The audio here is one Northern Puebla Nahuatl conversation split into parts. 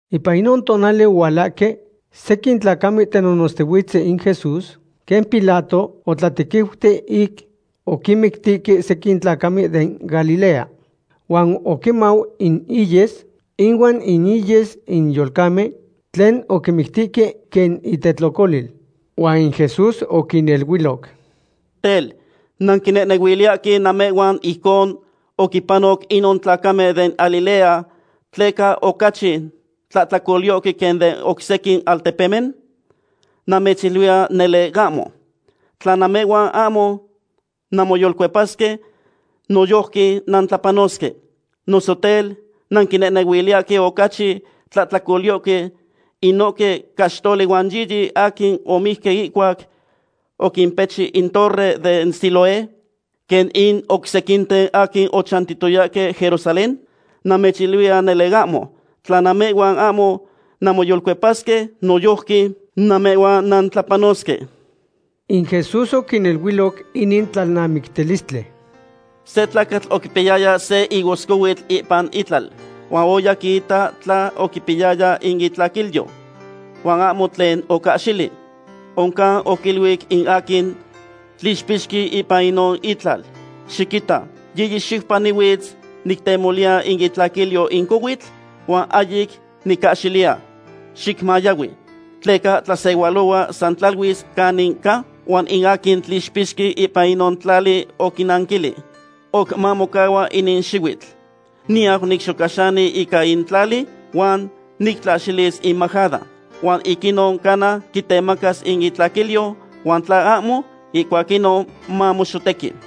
Ipan inon tonali ohualahque sequin tlacamen tenonotztihuitzen in Jesús quen Pilato otlatequiuti ic oquinmictihque sequin tlacamen den Galilea. Huan oquimau in inyes ihuan in inyes in yolcamen tlen oquinmictihque quen intetlocolil. Huan in Jesús oquiniluiloc: ―Tel, ¿nanquinehnehuiliyahque namehhuan ijcon oquimpanoc inon tlacamen den Galilea tleca ocachi tlahtlacolyohque quen den oc sequin altepemen? Namechiluiya nele ahmo. Tla namehhuan ahmo nanmoyolcuepasque, noyojqui nantlapanosque. Noso tel, ¿nanquinehnehuiliyahque ocachi tlahtlacolyohque inohque caxtoli huan yiyi aquin omijque ihcuac oquimpechi in torre den Siloé, quen in oc sequinten aquin ochantiyayahque Jerusalén? Namechiluiya nele ahmo. Tla namehhuan ahmo nanmoyolcuepasque, noyojqui namehhuan nantlapanosque. In Jesús oquiniluiloc inin tlalnamictilistli: ―Se tlacatl oquipiyaya se higoscohuitl ipan itlal, huan oya quiita tla oquipiyaya in itlaquilyo, huan ahmo tlen ocahxili. Oncan oquiluic in aquin tlixpixqui ipan inon itlal: “Xiquita, yiyi xiupa nihuitz nictemoliya in itlaquilyo in cohuitl, huan ahyic nicahxiliya. Xicmayahui. ¿Tleca tlasehualohua san tlaluis canin ca?” Huan in aquin tlixpixqui ipan inon tlali oquinanquilic: “Oc mamocahua inin xihuitl. Niyau nicxocaxani ica in tlali, huan nictlaxilis in majada. Huan ic inon cana quitemacas in itlaquilyo, huan tla ahmo, ihcuac inon, mamoxotequi.”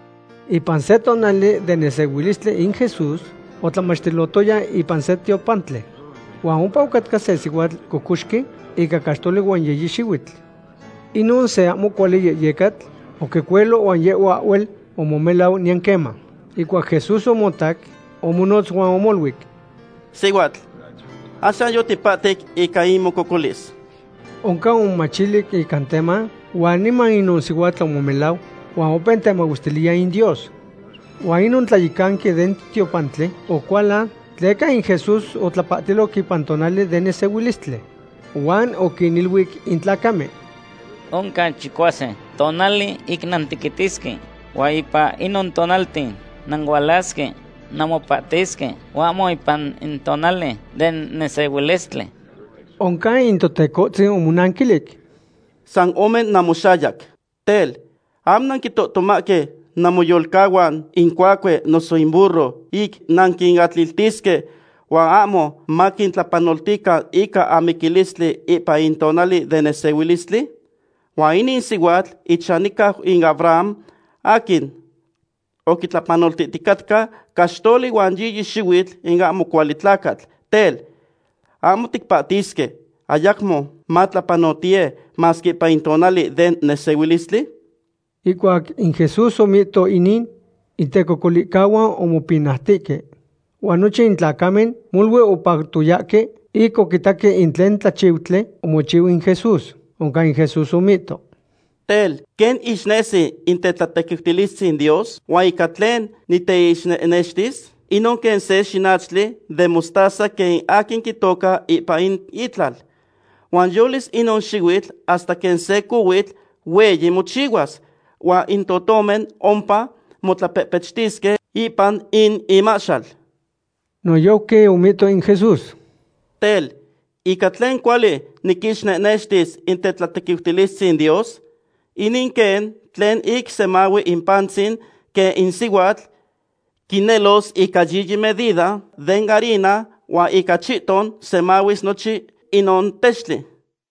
Ipan se tonali den nesehuilistli in Jesús otlamachtilotoya ipan se tiopantli. Huan ompa ocatca se sihuatl cocoxqui ica caxtoli huan yiyi xihuitl. Inon se ahmo cuali yehyecatl oquicuelo huan yehhua ahhuel omomelau niyan queman. Ihcuac Jesús omotac, omonotz huan omoluic: ―Sihuatl, axan yotipahtic ica in mococolis. Oncan omomachilic ica teman, huan niman inon sihuatl omomelau huan opeu temahuestiliya in Dios. Huan inon tlayecanqui den tiopantli ocualan, tleca in Jesús otlapahtiloc ipan in tonali den nesehuilistli. Huan oquiniluic in tlacamen: ―Oc oncan chicuasin tonali ic nantequitisque huan ipan inon tonalten nanualasque namopahtisque, huan ahmo ipan in tonali den nesehuilistli. Oncan in Totecohtzin omonanquilic: ―San ome namoxayac, tel, ¿ahmo nanquintohtomahque namoyolcahuan, in cuacue noso in burro, ic nanquinatliltisque huan ahmo maquintlapanoltican ica amiquilistli ipan in tonali den nesehuilistli? Huan inin sihuatl ichanihcau in Abraham aquin oquitlapanoltihticatca caxtoli huan yiyi xihuitl in ahmo cuali tlacatl, tel, ¿ahmo ticpahtisque, ayacmo matlapanotiye, masque ipan in tonali den nesehuilistli? Ihcuac in Jesús omihto inin, in tecocolihcahuan omopinautihque. Huan nochin in tlacamen molui opactoyahque ic oquitaque in tlen tlachiutli omochiu in Jesús. Oncan in Jesús omihto: ―Tel, ¿quen ixnesi in tetlatequiutilistzin Dios? ¿Huan ica tlen niteixnextis? Inon quen se xinachtli den mostaza quen in aquin quitoca ipan itlal. Huan yolis inon xihuitl hasta quen se cohuitl hueyi mochihuas. Huan in totomen ompa motlapehpechtisque ipan in imahxal. Noyojqui omihto in Jesús: ―Tel, ¿ica tlen cuali niquixnextis in tetlatequiutilistzin Dios? Inin quen tlen ic semahui in pantzin quen in sihuatl quinelos ica yiyi medida den harina huan ica chihton semahuis nochin inon textli.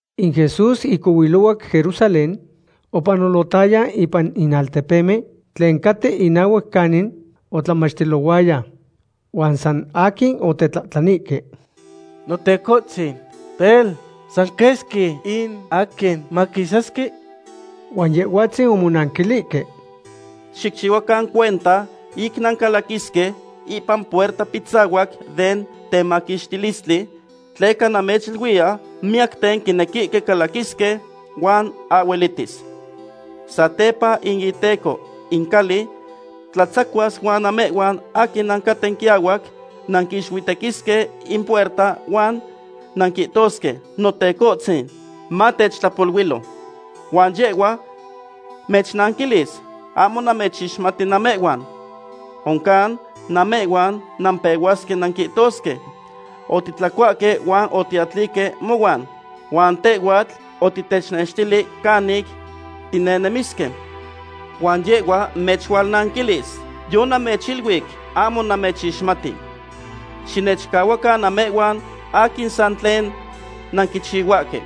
In Jesús ic ohuilohuac Jerusalén, opanolotaya ipan in altepemen tlen caten inahuac canin otlamachtilohuaya. Huan san aquin otetlahtlanihque: ―Notecohtzin, tel, ¿san quesqui in aquin maquisasque? Huan Yehhuatzin omonanquilihque: ―Xicchihuacan cuenta ic nancalaquisque ipan puerta pitzahuac den temaquixtilistli, tleca namechiluiya, miyacten quinequihque calaquisque, huan ahhuelihtis. Satepa in iteco in cali tlatzacuas huan namehhuan aquin nancaten quiahuac nanquixuitequisque in puerta huan nanquihtosque: “Notecohtzin, matechtlapoluilo.” Huan yehhua mechnanquilis: “Ahmo namechixmati namehhuan.” Oncan namehhuan nampehuasque nanquihtosque: “Otitlacuahque huan otiatlihque mohuan. Huan tehhuatl otitechnextili canic tinehnemisque.” Huan yehhua mechualnanquilis: “Yonamechiluic ahmo namechixmati. Xinechcahuacan namehhuan aquin san tlen nanquichihuahque.”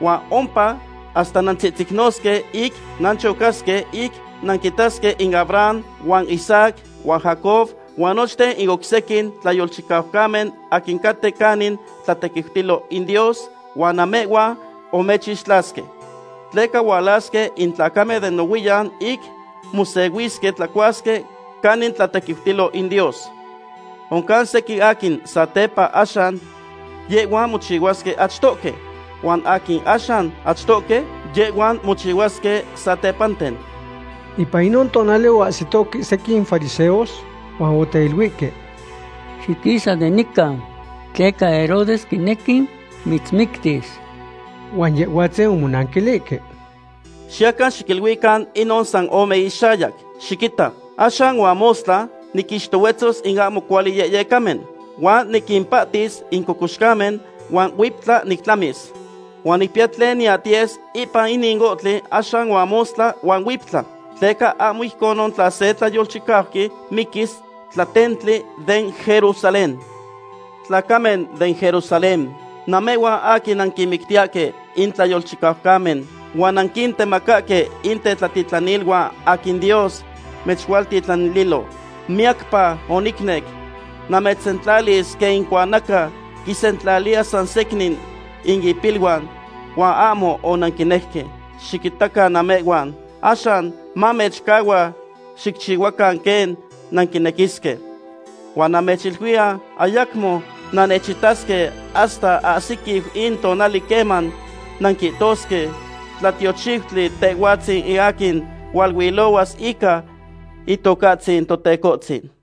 Huan ompa hasta nantzihtzicnosque ic nanchocasque ic nanquitasque in Abraham, huan Isaac, huan Jacob, huan nochten in oc sequin tlayolchicaucamen aquin caten canin tlatequiutilo in Dios, huan namehhuan omechixtlasque. Tleca hualasque in tlacamen de nohuiyan ic mosehuisque tlacuasque canin tlatequiutilo in Dios. Oncan sequin aquin satepanten axan, yehhuan mochihuasque achtohque. Huan sequin aquin axan achtohque yehhuan mochihuasque satepanten. Ipan inon tonali oahsitohque sequin fariseos huan oteiluihque: ―Xiquisa de nican tleca Herodes quinequi mitzmictis. Huan Yehhuatzin omonanquilihque: ―Xiyacan xiquiluican inon san ome ixayac: “Xiquita, axan huan mostla niquinixtohuetzos in ahmo cuali yehyecamen, huan niquimpahtis in cocoxcamen, huan huiptla nictlamis.” Huan nicpiya tlen niyahtiyes ipan inin ohtli axan huan mostla huan huiptla, tleca ahmo ijcon tla se tlayolchicauqui miquis tlatentli den Jerusalén. ’¡Tlacamen den Jerusalén, namehhuan aquin nanquinmictiyahque in tlayolchicaucamen huan nanquintemacahque in tetlatitlaniluan aquin Dios mechualtitlanililo! ¡Miyacpa onicnec namechsentlalis quen in cuanaca quinsentlaliya san secnin in ipiluan, huan ahmo onanquinejque! Xiquitacan namehhuan, axan namechcahua xicchihuacan quen nanquinequisque. Huan namechiluiya, ayacmo nannechitasque hasta ahsiquiu in tonali queman nanquihtosque: “Tlatiochiutli Tehhuatzin in aquin hualuilohuas ica Itocahtzin Totecohtzin.”